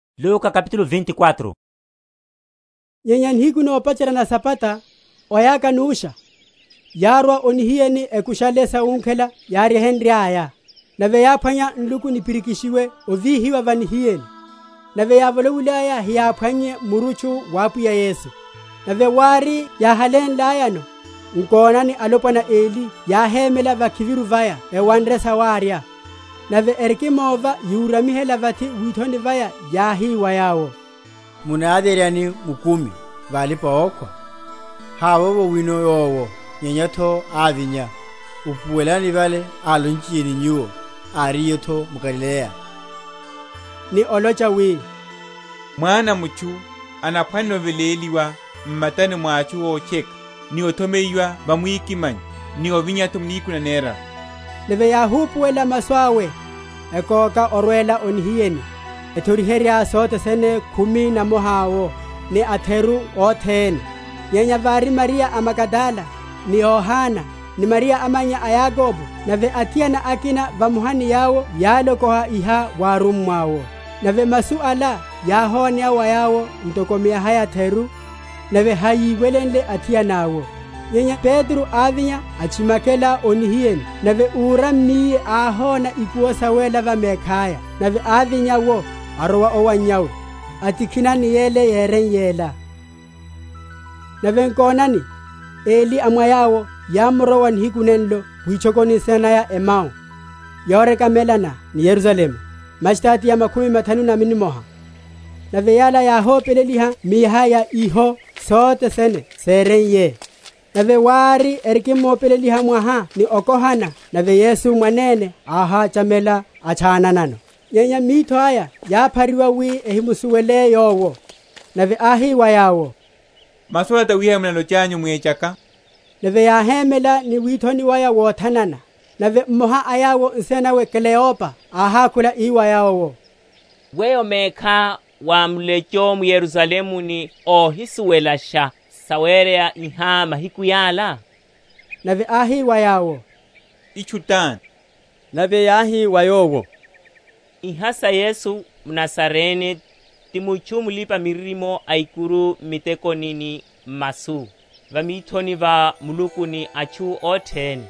Ovinya’tho wa Yesu. Nyenya nihiku nopacherya na Sabata, oyaka nusha, yárwa o nihiyeni ekushale sawunkhela yáryehenryaya. Nave yáphwanya nluku nipirikishiwe ovíhiwa va nihiyeni. Nave yávolowilaya heyáphwannye murutchu wa Apwiya Yesu. Nave wári, yáhalénlayano, nkonani alopwana eli yáhémela vakhiviru vaya ewanre sawarya; nave erikimova yuramihela vathi withoni waya, yáhi wa yawo, Munavyeryani mukumi va alipa‐okhwa? Hawowo wino Yowo, nyenya’tho ávinya: upuwelani vale álonchiye ni nyuwo, áriye’tho m’Galileya, ni olocha, wi, Mwana a mutchu anaphwanela oveléliwa m’matani mwa atchu ótcheka, ni othomeyiwa va mwikimanyo, ni ovinya’tho nihiku naneraru. Nave yáhupuwela masu awe, ekoka orwela o nihiyeni, ethoriherya sothe sene khumi na mmoha’wo, ni atheru othene. Nyenya vári Mariya a Magadala, ni Yohana, ni Mariya amannya a Yakobo, nave athiana akina vamoha ni yawo yálokoha iha wa arummwa’wo. Nave masu ala yáhoneya wa yawo ntoko miaha yatheru, nave hayíwelenle athiana’wo. Nyenya Petro ávinya atchimakela o nihiyeni, nave úrammiye áhona ikuwo sawéla va mekhaya; nave ávinya’wo arowa owannyawe, atikhina ni yele yereiye’la. Sawoneya va’phironi ya o Emau. Nave nkonani, eli a mwa yawo yámurowa nihiku nenlo witchokoni nsina naya Emau, yorekamelana ni Yerusalemu mastadiya makhumi mathanu na nimoha. Nave yala yáhopeleliha miaha ya iha sothene sereiye. Nave wári erikimopeleliha mwaha ni okohana, nave Yesu mwanene áhachamela, atchananano. Nyenya mithoaya yáphariwa wi ehimusuwelashe Yowo. Nave áhi wa yawo, Masu ala tawihai munalochelananyu mwechaka? Nave yáhémela ni withoni waya wothanana. Nave mmoha a yawo nsina nawe Kleopa áhákhula ii wa Yowo, Weyo mekhá wá mulecho m’Yerusalemu ni óhisuwelasha sawereya iha mahiku yala? Nave áhi wa yawo, Itchu tani? Nave yáhi wa Yowo, Iha sa Yesu mNazarene, ti mutchu mulipa‐miririmo aikuru m’mitekoni ni m’masu, va mithoni va Muluku ni atchu othene;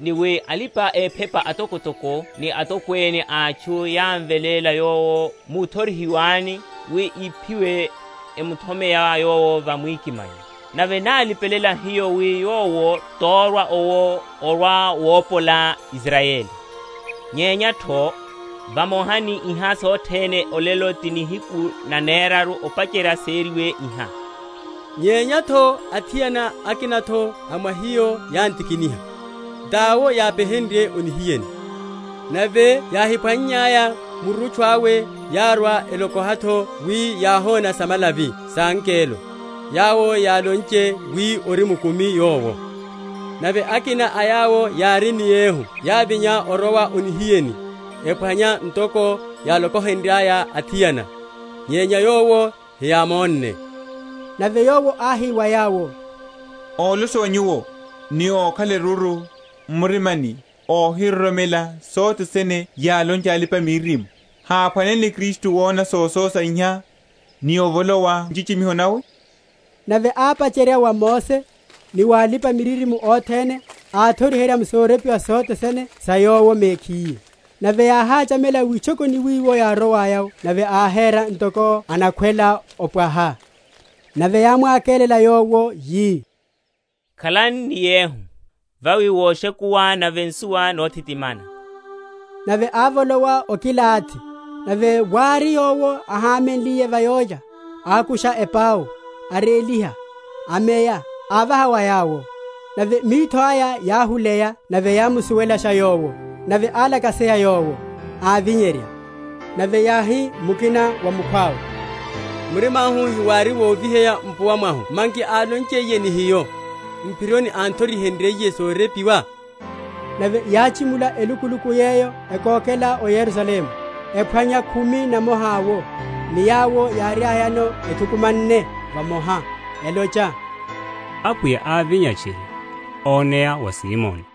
ni wi alipa‐ephepa atokotoko ni atokwene a atchu yámveléla Yowo wuthorihiwani wi iphiwe, emuthomeya Yowo va mwikimanyo. Nave nálipelela hiyo wi Yowo torwa owo orwa‐wopola Israyeli. Nyenya’tho, vamoha ni iha sothene olelo ti nihiku naneraru opacherya sereiye iha. Nyenya’tho athiana akina’tho a mwa hiyo yán’tikiniha, tawo yápeherenrye o nihiyeni; nave yáhiphwannyaya murutchu awe, yárwa, elokoha’tho wi yáhona samalavi sa angelo, yawo yálonche wi ori mkumi Yowo. Nave akina a yawo yári ni yehu yávinya orowa o nihiyeni, ephwanya ntoko yálokohenryaya athiana; nyenya Yowo heyámonne. Nave Yowo áhi wa yawo, Ólosowa nyuwo, ni ókhala erúru m’murimani óhiroromela sothene yálonchaya alipa‐miririmo! Háphwanenle Kristu wona sososa iha, ni ovolowa nchichimiho nawe? Nave ápacherya wa Mose, ni wa alipa‐miririmo othene, áthoriherya m’sorepiwa sothe sene sa Yowo mekhiye. Nave yáhachamela witchokoni wiwo yárowaya’wo; nave áhera ntoko anakhwela opwaha. Nave yámwakelela Yowo, yi, Khalani ni yehu: vawi woshekuwa, nave nsuwa nothitimana. Nave ávolowa okilathi. Nave wári Yowo áhamenliye va yólya, ákusha epau, aréliha, ameya, avaha wa yawo. Nave mithoaya yáhuleya, nave yámusuwelasha Yowo; nave álakaseya Yowo, ávinyerya. Nave yáhi mukina wa mukhwawe, Murima’hu hewári woviha mpuwa mwahu manki, álonchiye ni hiyo, m’phironi, án’thorihenryiye sorepiwa? Nave yáchimula elukuluku yeyo ekokela o Yerusalemu, ephwanya khumi na mmoha’wo, ni yawo yáriayano ethukumanne vamoha, elocha, Apwiya ávinya tchiri, oneya wa Simoni.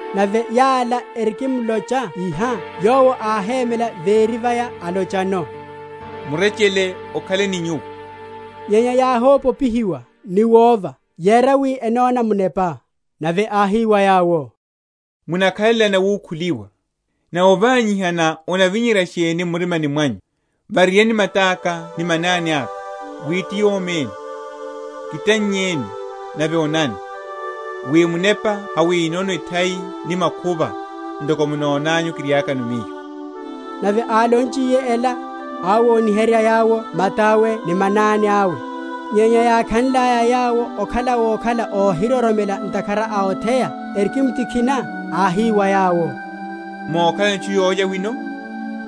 Nave yala erikimlocha iha, Yowo áhémela véri vaya; alochano, Murechele okhale ni nyuwo. Nyenya yáho?-?popihiwa ni wova, yera wi enona munepa. Nave áhi wa yawo, Munakhalelani awukhuliwa? nave ovanyihana onavinyerya sheni m’murimani mwanyu? Vareryani mata’ka ni manani aka, wi ti yomi ene: kitannyeni, nave onani; wi munepa hawinono ethai ni makhuva, ntoko munonanyu kiriakano Miyo. Nave álonchiye ela, áwoniherya yawo mata’we ni manani awe. Nyenya yákhanlaya yawo okhala wokhala óhiroromela ntakhara a otheya, erikimtikhina, áhi wa yawo, Mokhalano etchu yólya wino?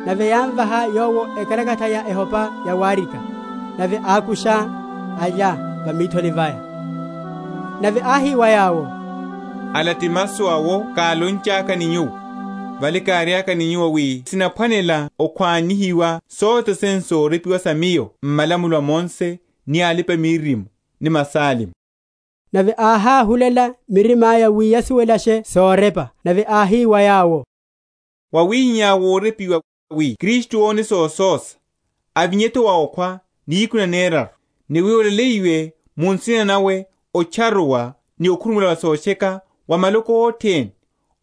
Nave yámvaha Yowo ekalakatha ya ehopa yawarika. Nave ákusha, alya va mithoni vaya. Nave áhi wa yawo, Ala ti masu awo kálonchaka ni nyuwo, vale káriaka ni nyuwo, wi sinaphwanela okhwa?-?nihiwa sothene sorepiwa sa Miyo m’malamulo a Mose, ni alipa‐miririmo, ni masalmo. Nave áháhulela mirima’ya, wi yasuwelashe sorepa; nave áhi wa yawo, Wawihihá worepiwa, wi Kristu one sososa, avinye’tho wa okhwa nihiku naneraru; ni wi olaleyiwe mu nsina nawe otcharuwa ni okhurumuwela wa sotcheka wa maloko othene,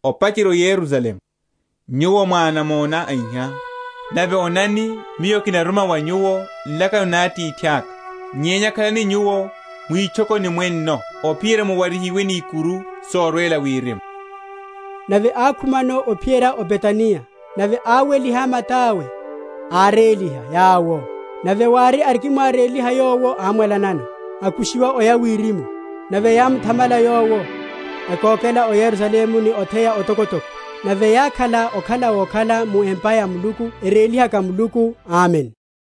opacherya o Yerusalemu. Nyuwo mwá anamona a iha. Nave onani, Miyo kinaruma va nyuwo nlakano na Atithaka; nyenya khalani nyuwo mwitchokoni mwenno, ophiyerya muwarihiwe ni ikuru sorwela wirimu. Owela wawe oya wirimu. Nave ákhumano ophiyerya o Betaniya; nave áweliha mata’we, áréliha yawo. Nave wári, arikimwaréliha Yowo ámwalanano, akushiwa oya wirimu. Nave yámuthamala Yowo, ekokela o Yerusalemu ni otheya otokotoko; nave yákhala okhala wokhala mu empa ya Muluku, erélihaka Muluku. Amen.